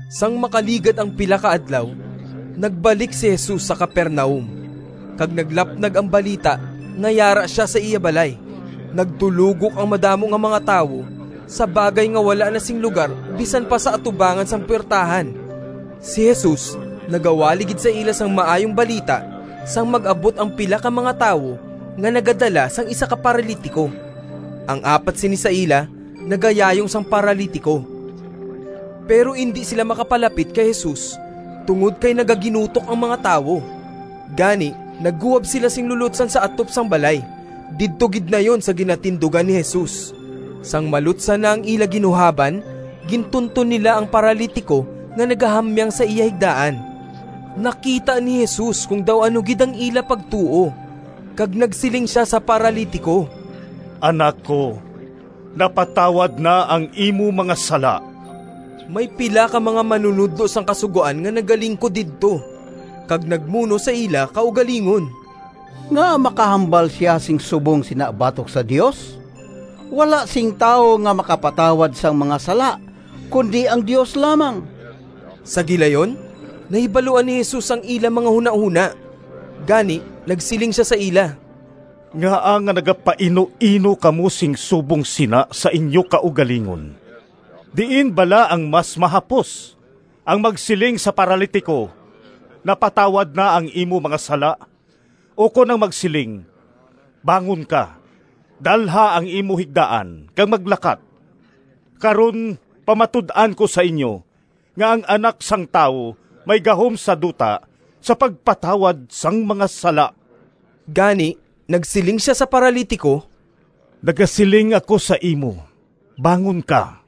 Sang makaligad ang pila ka adlaw, nagbalik si Jesus sa Capernaum, kag naglapnag ang balita nga yara sia sa iya balay. Nagdulogok ang madamo nga mga tawo sa bagay nga wala na sing lugar bisan pa sa atubangan sang puwertahan. Si Jesus nagawali gid sa ila sang Maayong Balita sang mag-abot ang pila ka mga tawo nga nagadala sang isa ka paralitiko—ang apat sini sa ila nagayayong sang paralitiko. Pero indi sila makapalapit kay Jesus tungod kay nagaginutok ang mga tawo. Gani nagguhab sila sing lulotsan sa atop sang balay, didto gid nayon sa ginatindugan ni Jesus. Sang malutsan na ang ila ginuhaban gintunton nila ang paralitiko nga nagahamyang sa iya higdaan. Nakita ni Jesus kon daw ano gid ang ila pagtuo, kag nagsiling sia sa paralitiko, “Anak ko, napatawad na ang imo mga sala.” May pila ka mga manunodlo sang Kasugoan nga nagalingkod didto kag nagmuno sa ila kaugalingon, “Ngaa makahambal sia sing subong sina batok sa Dios? Wala sing tawo nga makapatawad sang mga sala, kundi ang Dios lamang.” Sa gilayon nahibaluan ni Jesus ang ila mga hunahona, gani nagsiling sia sa ila, “Ngaa nga nagapainuino kamo sing subong sina sa inyo kaugalingon? Diin bala ang mas mahapos, ang magsiling sa paralitiko, ‘Napatawad na ang imo mga sala,’ ukon ang magsiling, ‘Bangon ka, dalha ang imo higdaan kag maglakat’? Karon pamatud-an ko sa inyo, nga ang Anak sang Tawo may gahom sa duta sa pagpatawad sang mga sala.” Gani nagsiling sia sa paralitiko, “Nagasiling ako sa imo, bangon ka,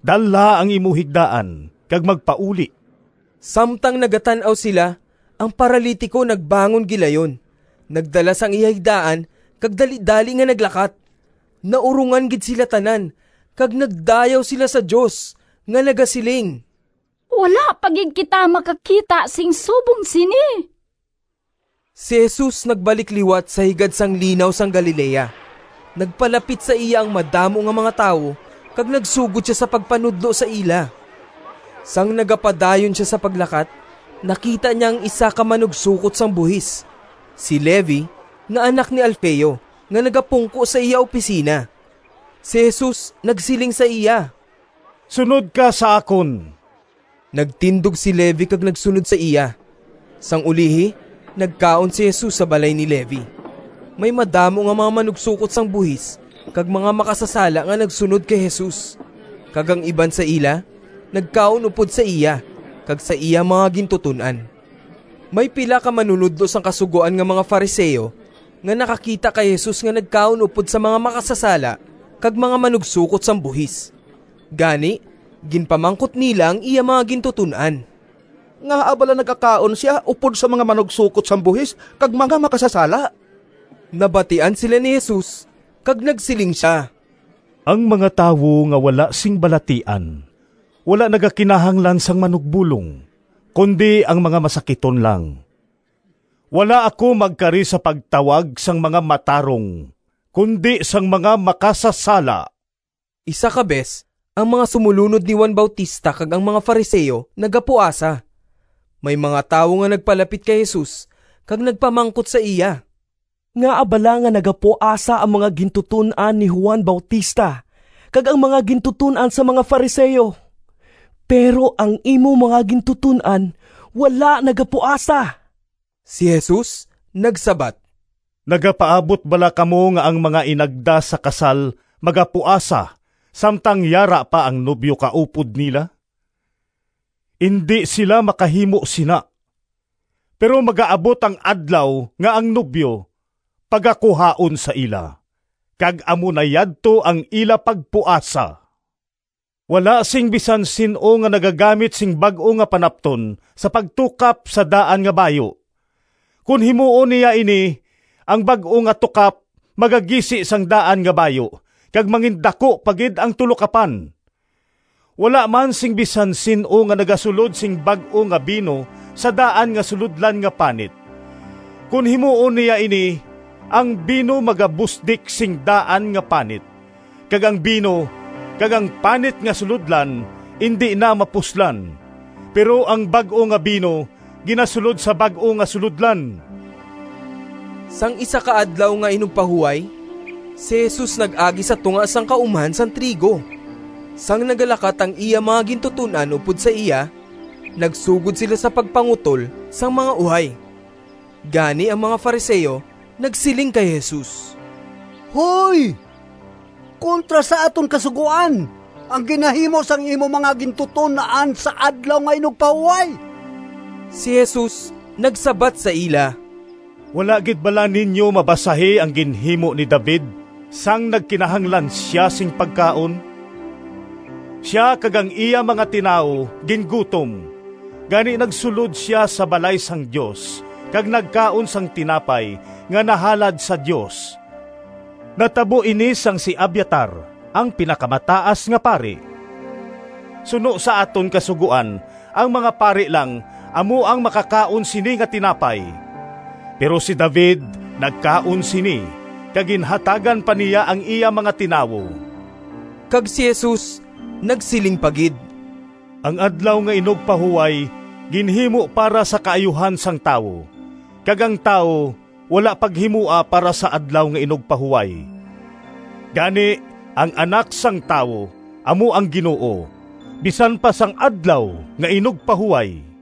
dalha ang imo higdaan kag magpauli!” Samtang nagatan-aw sila, ang paralitiko nagbangon gilayon, nagdala sang iya higdaan kag dalidali nga naglakat. Naurongan gid sila tanan kag nagdayaw sila sa Dios, nga nagasiling, “Wala pa gid kita makakita sing subong sini!” Si Jesus nagbalik liwat sa higad sang Linaw sang Galilea. Nagpalapit sa iya ang madamo nga mga tawo kag nagsugod sia sa pagpanudlo sa ila. Sang nagapadayon sia sa paglakat, nakita niya ang isa ka manugsokot sang buhis, si Levi nga anak ni Alfeo, nga nagapungko sa iya opisina. Si Jesus nagsiling sa iya, “Sunod ka sa akon.” Nagtindog si Levi kag nagsunod sa iya. Sang ulihi nagkaon si Jesus sa balay ni Levi. May madamo nga mga manugsokot sang buhis kag mga makasasala nga nagsunod kay Jesus, kag ang iban sa ila nagkaon upod sa iya kag sa iya mga gintuton-an. May pila ka manunodlo sang Kasugoan nga mga Fariseo nga nakakita kay Jesus nga nagkaon upod sa mga makasasala kag mga manugsokot sang buhis. Gani ginpamangkot nila ang iya mga gintuton-an, “Ngaa bala nagakaon sia upod sa mga manugsokot sang buhis kag mga makasasala?” Nabatian sila ni Jesus kag nagsiling sia, “Ang mga tawo nga wala sing balatian wala nagakinahanglan sang manugbolong, kundi ang mga masakiton lang. Wala ako magkari sa pagtawag sang mga matarong kundi sang mga makasasala.” Isa ka bes ang mga sumolunod ni Juan Bautista kag ang mga Fariseo nagapuasa. May mga tawo nga nagpalapit kay Jesus kag nagpamangkot sa iya, “Ngaa bala nga nagapuasa ang mga gintuton-an ni Juan Bautista kag ang mga gintuton-an sang mga Fariseo, pero ang imo mga gintuton-an wala nagapuasa?” Si Jesus nagsabat, “Nagapaabot bala kamo nga ang mga inagda sa kasal magapuasa samtang yara pa ang nobyo kaupod nila? Indi sila makahimo sina! Pero magaabot ang adlaw nga ang nobyo pagakuhaon sa ila, kag amo na yadto ang ila pagpuasa. “Wala sing bisan sin-o nga nagagamit sing bag-o nga panapton sa pagtukap sa daan nga bayu. Kon himuon niya ini, ang bag-o nga tukap magagisi sang daan nga bayu kag mangindaku pa gid ang tulokapan. Wala man sing bisan sin-o nga nagasulod sing bag-o nga bino sa daan nga sulodlan nga panit. Kon himuon niya ini, ang bino magabusdik sang daan nga panit, kag ang bino kag ang panit nga sulodlan indi na mapuslan. Pero ang bag-o nga bino ginasulod sa bag-o nga sulodlan!” Sang isa ka Adlaw nga Inugpahuway, si Jesus nag-agi sa tunga sang kaumhan sang trigo. Sang nagalakat ang iya mga gintuton-an upod sa iya, nagsugod sila sa pagpangutol sang mga uhay. Gani ang mga Fariseo nagsiling kay Jesus, “Hoy, kontra sa aton Kasugoan ang ginahimo sang imo mga gintuton-an sa Adlaw nga Inugpahuway!” Si Jesus nagsabat sa ila, “Wala gid bala ninyo mabasahi ang ginhimo ni David sang nagkinahanglan sia sing pagkaon? Sia kag ang iya mga tinawo gingutom, gani nagsulod sia sa balay sang Dios kag nagkaon sang tinapay nga nahalad sa Dios. Natabo ini sang si Abiatar ang Pinakamataas nga Pari. Suno sa aton Kasugoan ang mga pari lang amo ang makakaon sini nga tinapay, pero si David nagkaon sini, kag ginhatagan pa niya ang iya mga tinawo.” Kag si Jesus nagsiling pa gid, “Ang Adlaw nga Inugpahuway ginhimo para sa kaayuhan sang tawo kag ang tawo wala paghimoa para sa Adlaw nga Inugpahuway. Gani, ang Anak sang Tawo amo ang Ginoo bisan pa sang Adlaw nga Inugpahuway.”